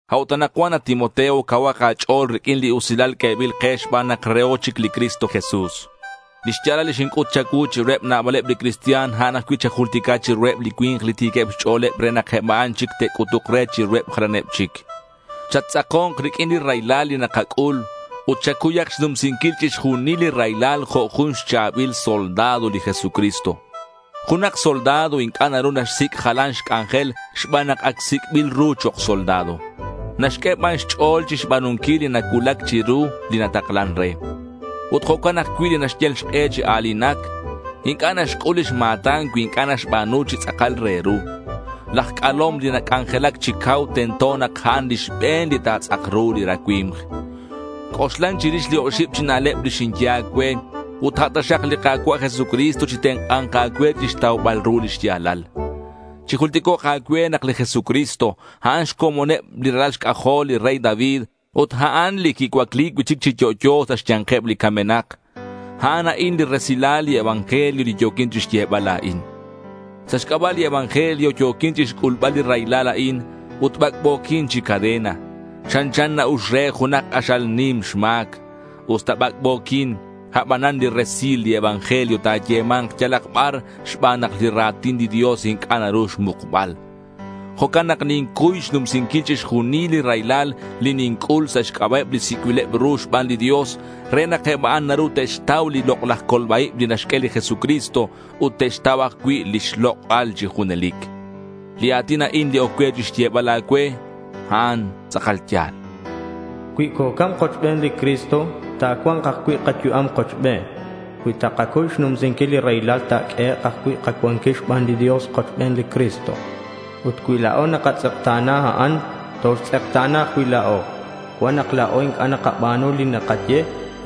A'ut anakcuan, at Timoteo, cauhak a̱ch'o̱l riq'uin li usilal q'uebil ke xban nak reho chic li Cristo Jesús. Li xya̱lal li xinc'ut cha̱cuu chiruheb nabaleb li cristian, a'an ajcui' chajultica chiruheb li cui̱nk li ti̱queb xch'o̱leb re nak eb a'an chic te'c'utuk re chiruheb jalaneb chic. Chattz'ako̱nk riq'uin li raylal li nakac'ul ut chacuyak xnumsinquil chixjunil li raylal jo' jun xcha̱bil soldado li Jesucristo. Junak soldado inc'a' naru naxsic' jalan xc'anjel xban nak ac sic'bil ru chok' soldado. Naxq'ue ban xch'o̱l chixba̱nunquil li nacuulac chiru li nataklan re. Ut jo'can ajcui' li naxyal xk'e chi a̱linac, inc'a' naxc'ul lix ma̱tan cui inc'a' naxba̱nu chi tz'akal re ru. Laj c'alom li nac'anjelac chi cau tento nak a'an li xbe̱n li ta̱tz'ak ru li racui̱mk. C'oxlan chirix li oxib chi na'leb li xinye a̱cue ut a' taxak li Ka̱cua' Jesucristo chitenk'a̱nk a̱cue chixtaubal ru li xya̱lal. Chijulticok' a̱cue nak li Jesucristo, a'an xcomoneb li ralal xc'ajol li rey David ut a'an li quicuacli cui'chic chi yo'yo sa' xya̱nkeb li camenak. A'an a'in li resilal li evangelio li yo̱quin chixyebal la̱in. Sa' xc'aba' li evangelio yo̱quin chixc'ulbal li raylal a'in, ut bac'bo̱quin chi cadena. Chanchan na-ux re junak k'axal nim xma̱c. Usta bac'bo̱quin, abanan li resil li evangelio ta̱yema̱nk yalak bar xban nak li ra̱tin li Dios inc'a' naru xmukbal. Jo'can nak nincuy xnumsinquil chixjunil li raylal li ninc'ul sa' xc'aba'eb li sic'bileb ru xban li Dios re nak eb a'an naru te'xtau li lok'laj colba-ib li naxq'ue li Jesucristo ut te'xtau ajcui' lix lok'al chi junelic. Li a̱tin a'in li oc cue xyebal a̱cue, a'an tz'akal ya̱l: Cui cocam kochben li Cristo, ta̱cua̱nk ajcui' kayu'am kochben. Cui takacuy xnumsinquil li raylal, ta̱q'uehek' ajcui' kacuanquil xban li Dios kochben li Cristo. Ut cui la̱o nakatz'ekta̱na, a'an toxtz'ekta̱na ajcui' la̱o. Cuan nak la̱o inc'a' nakaba̱nu li c'a'ru nakaye,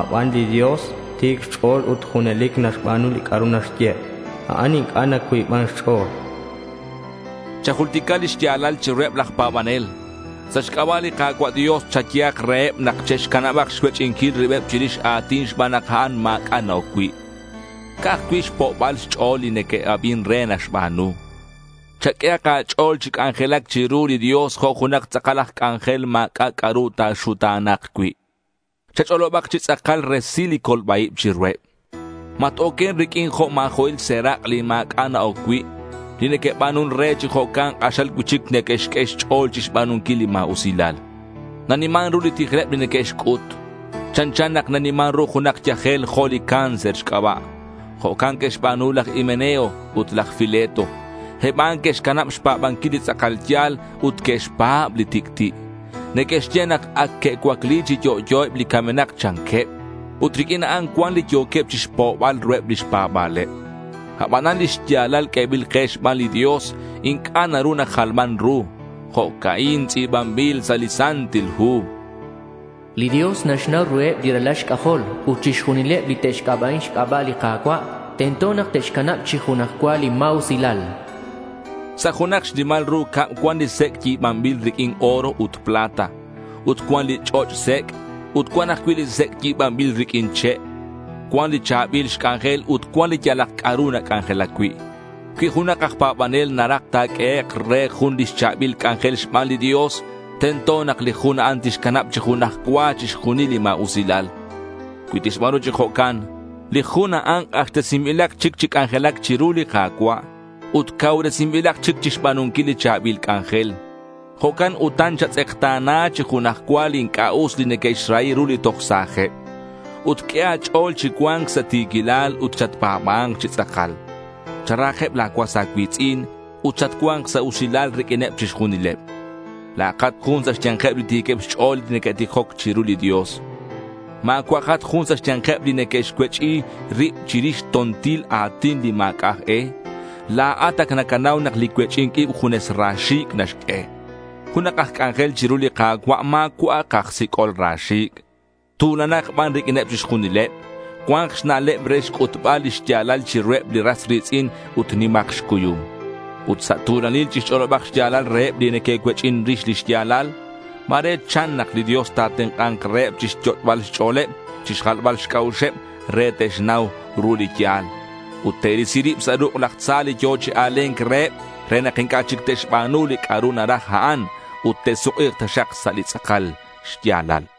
abanan li Dios ti̱c xch'o̱l ut junelic naxba̱nu li c'a'ru naxye. A'an inc'a' nacuiban xch'o̱l. Chajultica li xya̱lal chiruheb laj pa̱banel. Sa' xc'aba' li Ka̱cua' Dios chayehak reheb nak che'xcanabak xcuech'inquil ribeb chirix a̱tin xban nak a'an ma̱c'a' na-oc cui'. Ca'aj cui' xpo'baleb xch'o̱l li neque'abin re naxba̱nu. Chaq'uehak a̱ch'o̱l chi c'anjelac chiru li Dios jo' junak tz'akal aj c'anjel ma̱c'a' c'a'ru ta̱xuta̱na̱k cui'. Chach'olobak chi tz'akal resil li colba-ib chiruheb. Mat-oquen riq'uin jo' ma̱jo'il serak', li ma̱c'a' na-oc cui'. Li neque'ba̱nun re chi jo'can k'axal cui'chic neque'xq'ue xch'o̱l chixba̱nunquil li ma̱usilal. Naniman ru li tijleb li neque'xc'ut. Chanchan nak naniman ru junak yajel jo' li cáncer xc'aba'. Jo'can que'xba̱nu laj Himeneo ut laj Fileto. Eb a'an que'xcanab xpa̱banquil li tz'akal ya̱l ut que'xpa̱b li tic'ti'. Neque'xye nak ac que'cuacli chi yo'yo eb li camenak, chanqueb. Ut riq'uin a'an cuan li yo̱queb chixpo'bal ruheb lix pa̱ba̱leb. Abanan li xya̱lal q'uebil ke xban li Dios inc'a' naru najalman ru. Jo'ca'in tz'i̱banbil sa' li Santil Hu: li Dios naxnau ruheb li ralal xc'ajol, ut chixjunileb li te'xc'aba'in xc'aba' li Ka̱cua', tento nak te'xcanab chi junaj cua li ma̱usilal. Sa' junak xnimal ru cab cuan li sec' yi̱banbil riq'uin oro ut plata. Ut cuan li ch'och' sec' ut cuan ajcui' li sec' yi̱banbil riq'uin che'. Cuan li cha̱bil xc'anjel ut cuan li yalak c'a'ru nac'anjelac cui'. Cui junak aj pa̱banel naraj ta̱q'uehek' re jun lix cha̱bil c'anjel xban li Dios, tento nak li jun a'an tixcanab chi junaj cua chixjunil li ma̱usilal. Cui tixba̱nu chi jo'can, li jun a'an k'axtesinbilak chic chi c'anjelac chiru li Ka̱cua' ut cauresinbilak chic chixba̱nunquil li cha̱bil c'anjel. Jo'can utan chatz'ekta̱na chi junaj cua li inc'a' us li neque'xrahi ru li toj sa̱jeb. Ut q'ue a̱ch'o̱l chicua̱nk sa' ti̱quilal ut chatpa̱ba̱nk chi tz'akal. Charahakeb la̱ cuas a̱cui̱tz'in ut chatcua̱nk sa' usilal riq'uineb chixjunileb. La̱akat jun sa' xya̱nkeb li ti̱queb xch'o̱l li neque'tijoc chiru li Dios. Ma̱cua'akat jun sa' xya̱nkeb li neque'xcuech'i rib chirix to̱ntil a̱tin li ma̱c'a' aj e. La̱at ac nacanau nak li cuech'i̱nc ib junes ra xi̱c' naxq'ue. Junak aj c'anjel chiru li Ka̱cua' ma̱cua'ak aj sic'ol ra xi̱c'. Tu̱lanak ban riq'uineb chixjunileb. Cua̱nk xna'leb re xc'utbal li xya̱lal chiruheb li ras ri̱tz'in ut nimak xcuyum. Ut sa' tu̱lanil chixch'olobak xya̱lal reheb li neque'cuech'in rix li xya̱lal. Ma̱re chan nak li Dios ta̱tenk'a̱nk reheb chixyot'bal xch'o̱leb, chixjalbal xc'a'uxeb re te'xnau ru li ya̱l. Ut te'risi rib sa' ruk' laj tza li yo̱ chi a̱le̱nc reheb re nak inc'a' chic te'xba̱nu li c'a'ru naraj a'an. Ut te'suk'i̱k taxak sa' li tz'akal xya̱lal.